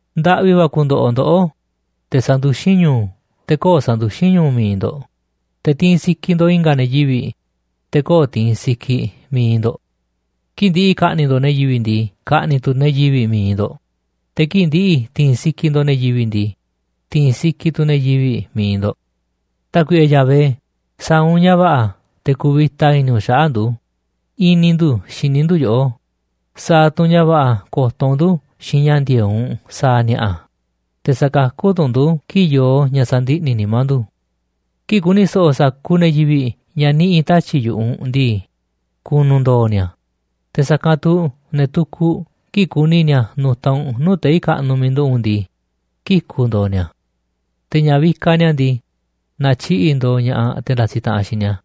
Ndaꞌvi va̱ ku̱ndo̱ꞌo̱ ndoꞌó, te̱ sanduxín ñu̱u̱, te̱ köo̱ꞌ sanduxín ñu̱u̱ mi̱iꞌ ndo̱ꞌ. Te̱ tiinꞌ sikiꞌ ndo̱ꞌ i̱nga̱ ne̱ yivi̱ꞌ, te̱ köo̱ꞌ tiinꞌ sikiꞌ mi̱iꞌ ndo̱ꞌ. Kii̱ꞌ ndi̱ꞌi̱ ka̱ꞌni̱ꞌ ndo̱ꞌ ne̱ yivi̱ꞌ ndii, ka̱ꞌni̱ꞌ tu̱ ne̱ yivi̱ꞌ mi̱iꞌ ndo̱ꞌ, te̱ kii̱ꞌ ndi̱ꞌi̱ ti̱i̱n sikiꞌ ndo̱ꞌ ne̱ yivi̱ꞌ ndii, ti̱i̱n sikiꞌ tu̱ ne̱ yivi̱ꞌ mi̱iꞌ ndo̱ꞌ. Tákuiꞌe Yahvé, sa̱a̱ u̱nꞌ ña̱ va̱ꞌa̱ te̱ ku̱vi̱ta i̱ni̱ u̱nꞌ xaꞌa̱ꞌ ndu̱. I̱ni̱ ndu̱ xini ndu̱ yoꞌó, sa̱a̱ tu̱ u̱nꞌ ña̱ va̱ꞌa̱ ko̱to̱ u̱nꞌ ndu̱ xiinꞌ ña̱ ndi̱e̱eꞌ u̱nꞌ sa̱a̱ ni̱a̱ꞌa̱, te̱ sa̱kakú tu̱ u̱nꞌ ndu̱ kii̱ꞌ yoo ña̱ sandiꞌni̱ nimá ndu̱. Kii̱ꞌ ku̱ni̱ so̱ꞌo̱ sa̱kuuꞌ ne̱ yivi̱ꞌ ña̱ niꞌi̱ tatyi̱ꞌ yu̱ꞌuꞌ u̱nꞌ ndii, ku̱nu̱ ndoo̱ ni̱a̱, te̱ sa̱kanꞌ tu̱ ne̱ tukuꞌ, kii̱ꞌ ku̱ni̱ ni̱a̱ nu̱ta̱ u̱nꞌ nuu̱ꞌ tei̱ kaꞌnuꞌ miiꞌ nduꞌu̱ꞌ u̱nꞌ ndii, kiku̱ ndo̱o̱ ni̱a̱. Te̱ ña̱ vikaꞌ ni̱a̱ ndii, na̱tyiꞌi̱ꞌ ndo̱o̱ ña̱ꞌaꞌ te̱ ndasiꞌ taꞌanꞌ xiinꞌ ni̱a̱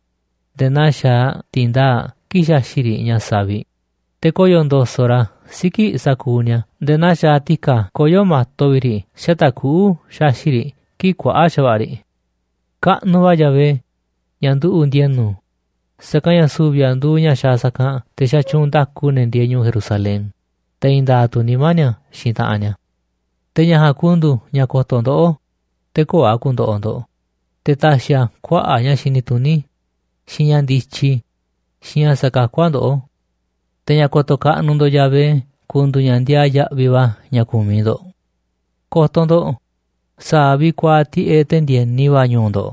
nde̱e̱ naa xaaꞌ ti̱ndaa̱ꞌ kii̱ꞌ xaxi̱ꞌ riꞌ ña̱ saviꞌ, te̱ koyo̱ ndo̱so̱ꞌ ra̱ siki̱ꞌ sa̱kuuꞌ ni̱a̱ nde̱e̱ naa xaaꞌ ti̱ka̱ koyó ma̱to vi̱ꞌ riꞌ xata̱ꞌ kuꞌu̱ xaxi̱ꞌ riꞌ kii̱ꞌ kuaꞌa̱ꞌ xa̱va̱ꞌa̱ riꞌ. Kaꞌnuꞌ va̱ Yahvé ña̱ nduꞌu̱ꞌ ndi̱e̱nu̱, sa̱kanꞌ ña̱ su̱vi̱ a̱ nduuꞌ ña̱ xaaꞌ sa̱kanꞌ te̱ xatyuunꞌ nda̱ku ne̱ ndieeꞌ ñu̱u̱ Jerusalén, te̱ i̱i̱n nda̱a̱ꞌ tu̱ nimá ni̱a̱ xiinꞌ taꞌanꞌ ni̱a̱. Te̱ ña̱ ja̱a̱nꞌ ku̱ndu̱u̱ ña̱ ko̱to̱ ndoꞌó, te̱ köo̱ꞌ a̱ ku̱ndo̱ꞌo̱ ndo̱ꞌ, te̱ ta̱xi̱ a̱ kuaꞌa̱ꞌ ña̱ xini tuní, xiinꞌ ña̱ ndityi, xiinꞌ ña̱ sa̱kakú a̱ ndoꞌó. Te̱ ña̱ ko̱to̱ kaꞌnuꞌ ndo̱ꞌ Yahvé ku̱ndu̱u̱ ña̱ ndiaa yaꞌviꞌ va̱ ña̱ ku̱miꞌ ndo̱ꞌ. Ko̱to̱ ndo̱ꞌ, sa̱a̱ vi̱ꞌ kuaaꞌ tiꞌeꞌ te̱ ndi̱e̱ni va̱ ñu̱u̱ ndo̱ꞌ,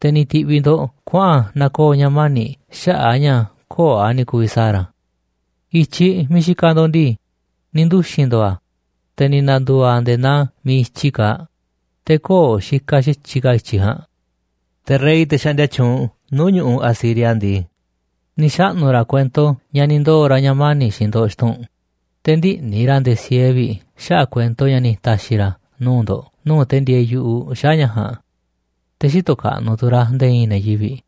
te̱ ni̱ ti̱ꞌviꞌ ndo̱ꞌ kuaꞌa̱n na̱koo̱ ña̱ mani̱ xaꞌa̱ꞌ a̱ ña̱ köo̱ꞌ a̱ ni̱ ku̱vi̱ sa̱a̱ ra̱. I̱tyiꞌ miiꞌ xikaꞌ ndo̱ꞌ ndii, ni̱ nduxi̱n ndo̱o̱ a̱, te̱ ni̱ na̱ndu̱u̱ a̱ nde̱e̱ naa miiꞌ i̱tyiꞌ kaaꞌ, te̱ köo̱ꞌ xikaꞌ xa̱tyiꞌ ka̱ i̱tyiꞌ ja̱a̱nꞌ. Te̱ rey, te̱ xaꞌndia tyuunꞌ nuu̱ꞌ ñu̱ꞌuꞌ Asiria ndii, ni̱ xaꞌnu̱ ra̱ kuento ña̱ ni̱ ndoo̱ ra̱ ña̱ mani̱ꞌ xiinꞌ ndo̱ꞌ xtun, te̱ ndïꞌni̱ ra̱ nde̱e̱ sieeꞌ vi̱ꞌ xaꞌa̱ꞌ kuento ña̱ ni̱ ta̱xi̱ ra̱ nuu̱ꞌ ndo̱ꞌ nuu̱ꞌ te̱ ndieeꞌ yu̱ꞌuꞌ xaꞌa̱ꞌ ña̱ ja̱a̱nꞌ. Te̱ xïtoꞌ kaꞌnuꞌ tu̱ ra̱ nde̱e̱ i̱i̱n ne̱ yivi̱ꞌ.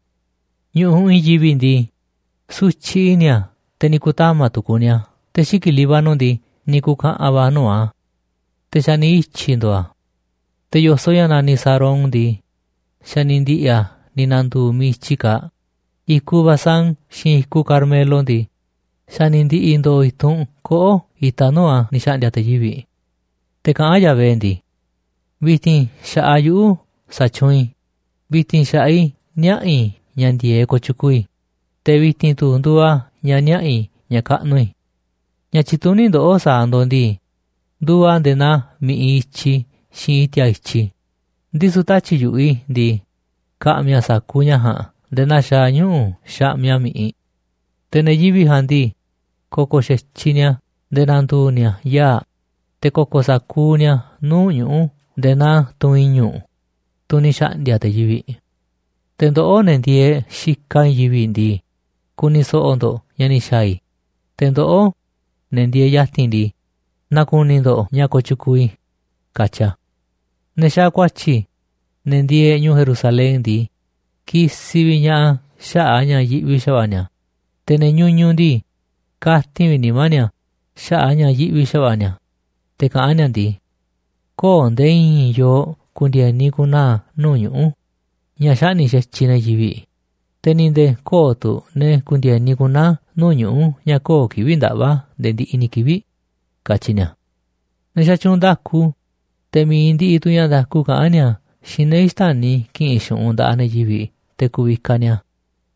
Ñu̱ꞌuꞌ i̱i̱n yivi̱ꞌ ndii, sutyiꞌ i̱ni̱ a̱, te̱ ni̱ ku̱tama̱ tu̱ kuni a̱. Te̱ xiki̱ꞌ Líbano ndii, ni̱ ku̱ka̱ꞌa̱n va̱ nuu̱ꞌ a̱, te̱ xa̱ ni̱ ityi̱ ndo̱o̱ a̱. Te̱ yo̱soꞌ ña̱ naniꞌ Sarón ndii, xa̱ ni̱ ndi̱ꞌi̱ a̱ ni̱ na̱ndu̱u̱ miiꞌ i̱tyi kaaꞌ, i̱kuꞌ Basán xiinꞌ i̱kuꞌ Carmelo ndii, xa̱ ni̱ ndi̱ꞌi̱ ndo̱o̱ i̱tunꞌ koꞌó itaꞌ nuu̱ꞌ a̱ ni̱ xa̱ꞌndi̱a̱ te̱ yivi̱ꞌ. Te̱ kaꞌán Yahvé ndii: “Vi̱ti̱n xa̱ꞌaꞌ yuꞌu̱ sa̱tyuunꞌ i̱, vi̱ti̱n xa̱ꞌaꞌ i̱ niaꞌa̱ i̱ ña̱ ndi̱e̱eꞌ kooꞌ tyukuuꞌ i̱, te̱ vi̱ti̱n tu̱ nduuꞌ a̱ ña̱ niaꞌa̱ i̱ ña̱ kaꞌnuꞌ i̱. Ña̱ tyituní ndoꞌó sa̱a̱ ndo̱ꞌ ndii, nduuꞌ a̱ nde̱e̱ naa mi̱ꞌiꞌ i̱tyi xiinꞌ i̱ti̱a̱ i̱tyi, ndisu̱ tatyi̱ꞌ yu̱ꞌuꞌ i̱ ndii, ka̱ꞌmi̱ a̱ sa̱kuuꞌ ña̱ ja̱a̱nꞌ nde̱e̱ naa xaaꞌ ñuꞌu̱ xaꞌmiꞌ a̱ mi̱ꞌiꞌ. Te̱ ne̱ yivi̱ꞌ jaa̱nꞌ ndii, ko̱ko̱ xa̱tyiꞌ ni̱a̱ nde̱e̱ na̱ndu̱u̱ ni̱a̱ yaa̱ꞌ, te̱ ko̱ko̱ sa̱kuuꞌ ni̱a̱ nuu̱ꞌ ñuꞌu̱ nde̱e̱ naa tunꞌ i̱ñu̱ꞌ, tunꞌ ni̱ xa̱ꞌndi̱a̱ te̱ yivi̱ꞌ. Te̱ ndoꞌó, ne̱ ndieeꞌ xikaꞌ i̱i̱n yivi̱ꞌ ndii, ku̱ni̱ so̱ꞌo̱ ndo̱ꞌ ña̱ ni̱ xa̱a̱ i̱. Te̱ ndoꞌó, ne̱ ndieeꞌ ya̱ti̱n ndii, na̱ku̱ni̱ ndo̱ꞌ ña̱ kooꞌ tyukuuꞌ i̱”, katyi a̱. Ne̱ xaaꞌ ku̱a̱tyi̱, ne̱ ndieeꞌ ñu̱u̱ Jerusalén ndii, kisiꞌ vi̱ꞌ ña̱ꞌaꞌ a̱ xaꞌa̱ꞌ a̱ ña̱ yiꞌvi xa̱va̱ꞌa̱ ni̱a̱. Te̱ ne̱ ñuñuꞌ ndii, katin vi̱ꞌ nimá ni̱a̱ xaꞌa̱ꞌ a̱ ña̱ yiꞌvi xa̱va̱ꞌa̱ ni̱a̱, te̱ kaꞌán ni̱a̱ ndii: “Köo̱ꞌ nde̱e̱ i̱i̱n yooꞌ ku̱ndi̱e̱ni ku̱naa̱ nuu̱ꞌ ñuꞌu̱ ña̱ xaꞌni̱ꞌ xa̱tyiꞌ ne̱ yivi̱ꞌ, te̱ ni̱ nde̱e̱ köo̱ꞌ tu̱ ne̱ ku̱ndi̱e̱ni ku̱naa̱ nuu̱ꞌ ñuꞌu̱ ña̱ köo̱ꞌ kivi̱ꞌ ndaꞌva̱ nde̱e̱ ndiꞌiꞌ ni̱ kivi̱ꞌ”, katyi ni̱a̱. Ne̱ xatyuunꞌ nda̱ku, te̱ mi̱iꞌ ndiꞌiꞌ tu̱ ña̱ nda̱ku kaꞌán ni̱a̱ xiinꞌ ne̱ xtäni̱ ki̱ꞌi̱n xu̱ꞌunꞌ nda̱ꞌaꞌ ne̱ yivi̱ꞌ te̱ ku̱vikaꞌ ni̱a̱,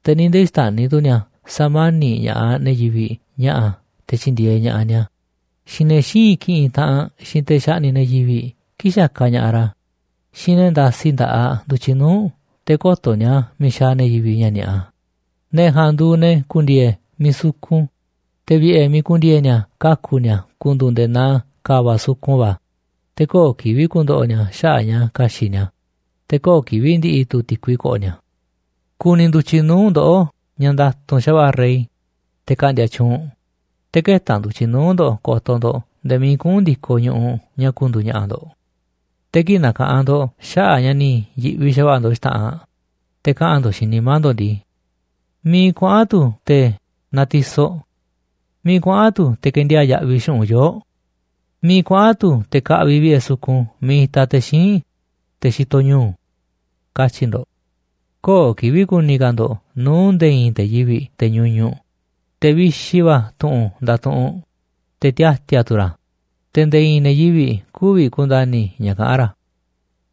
te̱ ni̱ nde̱e̱ xtäni̱ tu̱ ni̱a̱ sa̱mani̱ꞌ ña̱ꞌaꞌ ne̱ yivi̱ꞌ ña̱ꞌa̱ te̱ tyi̱ndi̱e̱eꞌ ña̱ꞌaꞌ ni̱a̱, xiinꞌ ne̱ xïinꞌ ki̱ꞌi̱n taꞌanꞌ xiinꞌ te̱ xaꞌni̱ꞌ ne̱ yivi̱ꞌ kii̱ꞌ xakaꞌ ña̱ꞌaꞌ ra̱, xiinꞌ ne̱ ndasi nda̱ꞌaꞌ ndu̱tyiꞌ nuu̱ꞌ te̱ kö̱to̱ ni̱a̱ miiꞌ xaaꞌ ne̱ yivi̱ꞌ ña̱ ni̱a̱ꞌa, ne̱ ja̱a̱nꞌ nduuꞌ ne̱ ku̱ndi̱e̱e̱ miiꞌ sukun, te̱ vi̱ꞌe̱ miiꞌ ku̱ndi̱e̱e̱ ni̱a̱ kaku̱ ni̱a̱ ku̱ndu̱u̱ nde̱e̱ naa ka̱va̱ꞌ sukun va̱, te̱ köo̱ꞌ kivi̱ꞌ ku̱ndo̱ꞌo̱ ni̱a̱ xaꞌa̱ꞌ ña̱ ka̱xi̱ꞌ ni̱a̱, te̱ köo̱ꞌ kivi̱ꞌ ndi̱ꞌi̱ tu̱ ti̱kui ko̱ꞌo̱ ni̱a̱. Ku̱ni̱ ndu̱tyiꞌ nuu̱ꞌ ndoꞌó ña̱ nda̱tu̱nꞌ xa̱va̱ꞌa̱ rey, te̱ ka̱ꞌndi̱a̱ tyuunꞌ, te̱ kë̱ta̱ ndu̱tyiꞌ nuu̱ꞌ ndo̱ꞌ ko̱to̱ ndo̱ꞌ nde̱e̱ miiꞌ kuꞌu̱n ndi̱koꞌ ñu̱ꞌuꞌ ña̱ ku̱ndu̱u̱ ña̱ꞌa̱ ndo̱ꞌ. Te̱ kii̱ꞌ na̱ka̱ꞌanꞌ ndo̱ꞌ xaꞌa̱ꞌ ña̱ ni̱ yi̱ꞌvi xa̱va̱ꞌa̱ ndo̱ꞌ xta̱ꞌanꞌ, te̱ kaꞌa̱n ndo̱ꞌ xiinꞌ nimá ndo̱ꞌ ndii: “¿Miiꞌ kuaꞌa̱n tu̱ te̱ natisoꞌ? ¿Miiꞌ kuaꞌa̱n tu̱ kendiaa̱ꞌ yaꞌviꞌ xu̱ꞌunꞌ yoo̱ꞌ? ¿Miiꞌ kuaꞌa̱n tu̱ te̱ kaꞌviꞌ vi̱ꞌe̱ sukun miiꞌ itaꞌ te̱ xíinꞌ, te̱ xitoꞌ ñu̱u̱?”, katyi̱ ndo̱ꞌ. Köo̱ꞌ kivi̱ꞌ ku̱ni̱ ka̱ ndo̱ꞌ nuu̱ꞌ nde̱e̱ i̱i̱n te̱ yivi̱ꞌ, te̱ ñuñuꞌ, te̱ vixi va̱ tu̱ꞌu̱n ndatuꞌunꞌ, te̱ tiati̱a̱ tu̱ ra̱, te̱ nde̱e̱ i̱i̱n ne̱ yivi̱ꞌ kü̱vi̱ ku̱nda̱ni̱ ña̱ kaꞌán ra̱.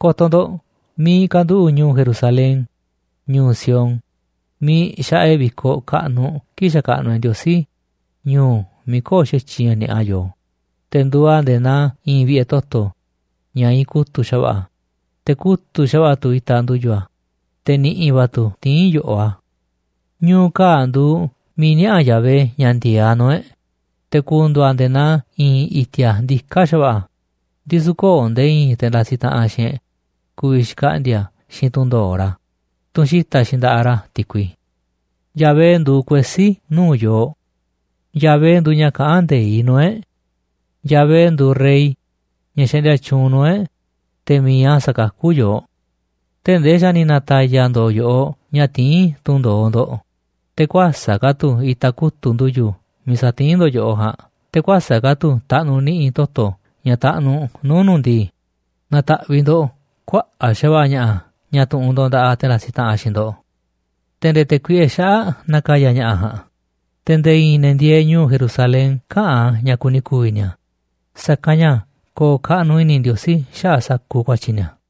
Ko̱to̱ ndo̱ꞌ miiꞌ kanduꞌu̱ꞌ ñu̱u̱ Jerusalén, ñu̱u̱ Sión, miiꞌ xaꞌa e̱ꞌ vi̱koꞌ kaꞌnuꞌ kii̱ꞌ xakaꞌnuꞌ e̱ꞌ Ndiosí, ñu̱u̱ miiꞌ köo̱ꞌ xa̱tyiꞌ ña̱ ni̱a̱ꞌa yooꞌ. Te̱ nduuꞌ a̱ nde̱e̱ naa i̱i̱n vi̱ꞌe̱ toto̱ ña̱ iinꞌ kutu̱ꞌ xa̱va̱ꞌa̱, te̱ kutu̱ꞌ xa̱va̱ꞌa̱ tu̱ itaꞌ ndu̱yu̱ a̱, te̱ ni̱ꞌi̱ va̱ tu̱ tiín yo̱ꞌoꞌ a̱. Ñu̱u̱ kaa̱ꞌ nduuꞌ miiꞌ niaꞌa̱ Yahvé ña̱ ndi̱e̱eꞌ a̱ nuu̱ꞌ e̱ꞌ, te̱ ku̱ndu̱u̱ a̱ nde̱e̱ naa i̱i̱n i̱ti̱a̱ ndiká xa̱va̱ꞌa̱, ndisu̱ köo̱ꞌ nde̱e̱ i̱i̱n te̱ ndasiꞌ taꞌanꞌ xiinꞌ e̱ꞌ ku̱vi̱ xkaꞌndi̱a̱ xiinꞌ tunꞌ ndo̱oꞌ ra̱, tunꞌ xita̱ꞌ xiinꞌ nda̱ꞌaꞌ ra̱ ti̱kui. Yahvé nduuꞌ kuesí nuu̱ꞌ yooꞌ. Yahvé nduuꞌ ña̱ kaꞌán nde̱iꞌ nuu̱ꞌ e̱ꞌ. Yahvé nduuꞌ rey ña̱ xaꞌndia tyuunꞌ nuu̱ꞌ e̱ꞌ, te̱ mi̱iꞌ a̱ sa̱kakú yooꞌ. Tee̱ꞌ ndee xa̱ ni̱ na̱ta̱ya̱ ndo̱o̱ yo̱ꞌoꞌ ña̱ tiín tunꞌ ndo̱oꞌ ndo̱ꞌ, te̱ kuäsa̱ꞌ ka̱ tu̱ itaꞌ kutu̱ꞌ ndu̱yu̱ miiꞌ satiín ndo̱ꞌ yo̱ꞌoꞌ ja̱a̱nꞌ, te̱ kuäsa̱ꞌ ka̱ tu̱ taꞌnuꞌ ni̱ꞌi̱ toto̱ ña̱ taꞌnuꞌ nuu̱ꞌ nu̱ꞌ ndii, na̱ta̱ꞌviꞌ ndo̱ꞌ kuaꞌa̱ꞌ xa̱va̱ꞌa̱ ña̱ꞌa̱ ña̱ tu̱ꞌu̱n ndo̱ꞌ nda̱ꞌaꞌ te̱ ndasiꞌ taꞌanꞌ xiinꞌ ndo̱ꞌ, te̱ nde̱e̱ te̱ kuiꞌe xaꞌa̱ꞌ na̱ka̱ya̱ ña̱ꞌa̱ ja̱a̱nꞌ. Te̱ nde̱e̱ i̱i̱n ne̱ ndieeꞌ ñu̱u̱ Jerusalén käꞌa̱n ña̱ kuni ku̱vi̱ ni̱a̱, sa̱kanꞌ ña̱ ko̱o̱ kaꞌnuꞌ i̱ni̱ Ndiosí xaꞌa̱ꞌ sa̱kuuꞌ ku̱a̱tyi̱ ni̱a̱.